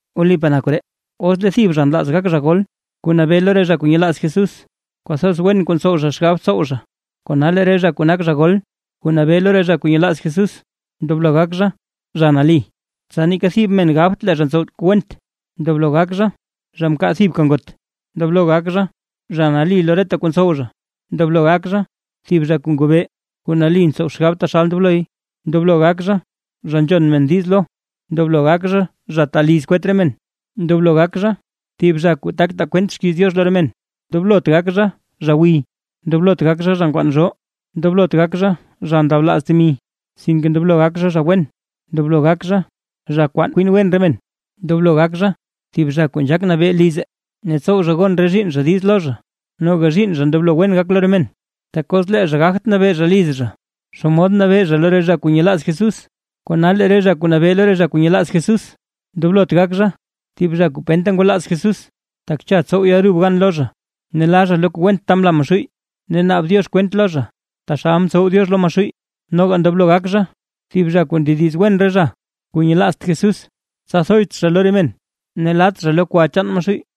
Wlipaa na koree, os lee thib zha nlaaz gak zha gol kuu nabee lo re zha kuu nyelaaz Jesús, kwathoz wen kuu ntsow zha xgab tsow zha. Kona lee re zha kuu nak zha gol kuu nabee lo re zha kuu nyelaaz Jesús, ndoblo gak zha: zha nali, tsa neeka thib men gabt lee zha ntsow kuu went, ndoblo gak zha, zha mkaa thibka ngot, ndoblo gak zha, zha nali lo reta kuu ntsow zha, ndoblo gak zha, thib zha kuu ngobee, kuu nali ntsow xgab taxal ndobloy, ndoblo gak zha, zha nzhon men diiz lo, ndoblo gak zha, zha taa liz kwet re men, ndoblo gak zha, thib zha kuu tak taa kwent xkiiz Diox lo re men. Ndoblot gak zha, zha gwiy, ndoblot gak zha, zha nkwaan zhoo, ndoblot gak zha, zha ndablaaz temi, sinke ndoblo gak zha, zha wen, ndoblo gak zha, zha kwaan kwin wen re men. Ndoblo gak zha thib zha kuu nzhaak nabee lize, ne tsow zha gon re zhiinn zha diiz lo zha, noga zhiinn zha ndoblo wen gak lo re men. Tak os lee zha gagt zha nabee zha liz zha, ¿xomod nabee zha lo re zha kuu nyelaaz Jesús? Kona lee zha kuu nabee lo re zha kuu nyelaaz Jesús, ndoblot gak zha thib zha kuu penta ngwalaaz Jesús, tak cha tsow yalrub gan lo zha, ne la zha lo kuu went ta mla Maxuuy, ne naab Diox kwent lo zha, taxal mtsow Diox lo Maxuuy. Noga ndoblo gak zha thib zha kuu ndediz wen re zha kuu nyelaazt Jesús, tsa thoyt zha lo re men, ne lat zha lo kwa chaan Maxuuy.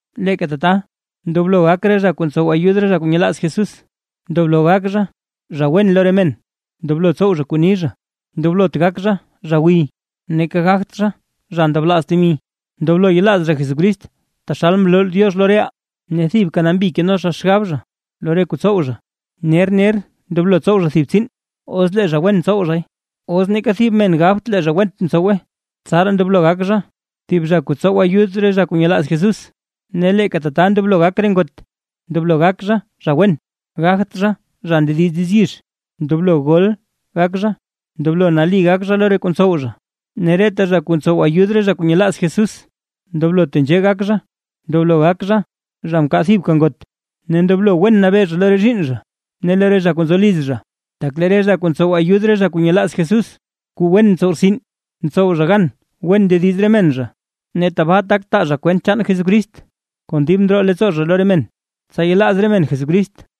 Leeka tata, ndoblo gak re zha kuu ntsow ayud re zha kuu nyelaaz Jesús: ndoblo gak zha, zha wen lo re men, ndoblo tsow zha kuu ni zha, ndoblot gak zha, zha gwiy, neeka gagt zha, zha ndablaaz temi. Ndoblo yelaaz zha Jesucrist taxal mloo Diox lo reʼaa, ne thibka nambi keno zha xgab zha lo re kuu tsow zha. Ner ner ndoblo tsow zha thib tsiin, os lee zha wen tsow zhay, os neeka thib men gabt lee zha went mtsowe, tsaraa ndoblo gak zha thib zha kuu tsow ayud re zha kuu nyelaaz Jesús. Ne leeka tata ndoblo gak re ngot: ndoblo gak zha, zha wen, gagt zha, zha ndediz diiz yizh, ndoblo gol gak zha, ndoblo nali gak zha lo re kuu tsow zha. Ne reta zha kuu ntsow ayud re zha kuu nyelaaz Jesús ndoblo tenzhee gak zha: ndoblo gak zha, zha mkaa thibka ngot, ne ndoblo wen nabee zha lo re zhiinn zha ne lo re zha kuu nzo liz zha. Tak lee re zha kuu ntsow ayud re zha kuu nyelaaz Jesús kuu wen ntsow rtsin, ntsow zha gan wen ndediz re men zha, ne tabaa tak taa zha kwent chaan Jesucrist kon dib ndroo leettsoo zha lo re men, tsa yelaaz re men Jesucrist.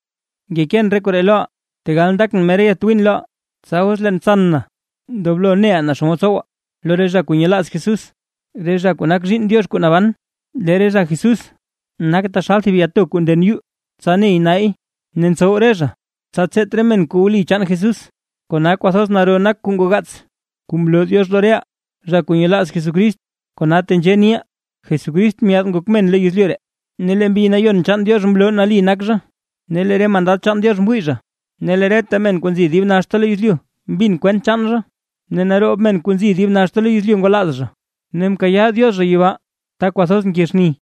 Ngekeen re koree loʼa; tegal ndakʼn mera yatwiin loʼa, tsa os leen tsan na, ndoblo neʼa naa xomod tsowa lo re zha kuu nyelaaz Jesús, re zha kuu nak zhiinn Diox kuu naban. Lee re zha Jesús nak taxal thib yato kuu nden yuu tsa ney nay, ne ntsow re zha tsa tseet re men kuu wli chaan Jesús. ¡Kona kwathoz naro nak kuu ngogaats, kuu mloo Diox lo reʼaa zha kuu nyelaaz Jesucrist! Kona tenzhee niʼaa: Jesucrist myaad ngok men lo yezlyu ree, ne lee Mbi Nayon chaan Diox mloo nali nak zha, ne lee re mandad Diox mwii zha, ne lee reta men kuu nzi dib naxta lo yezlyu mbin kwent chaan zha, ne naroob men kuu nzi dib naxta lo yezlyu ngwalaaz zha, ne mkayaa Diox zha yibaa ta kwathoz nke xni.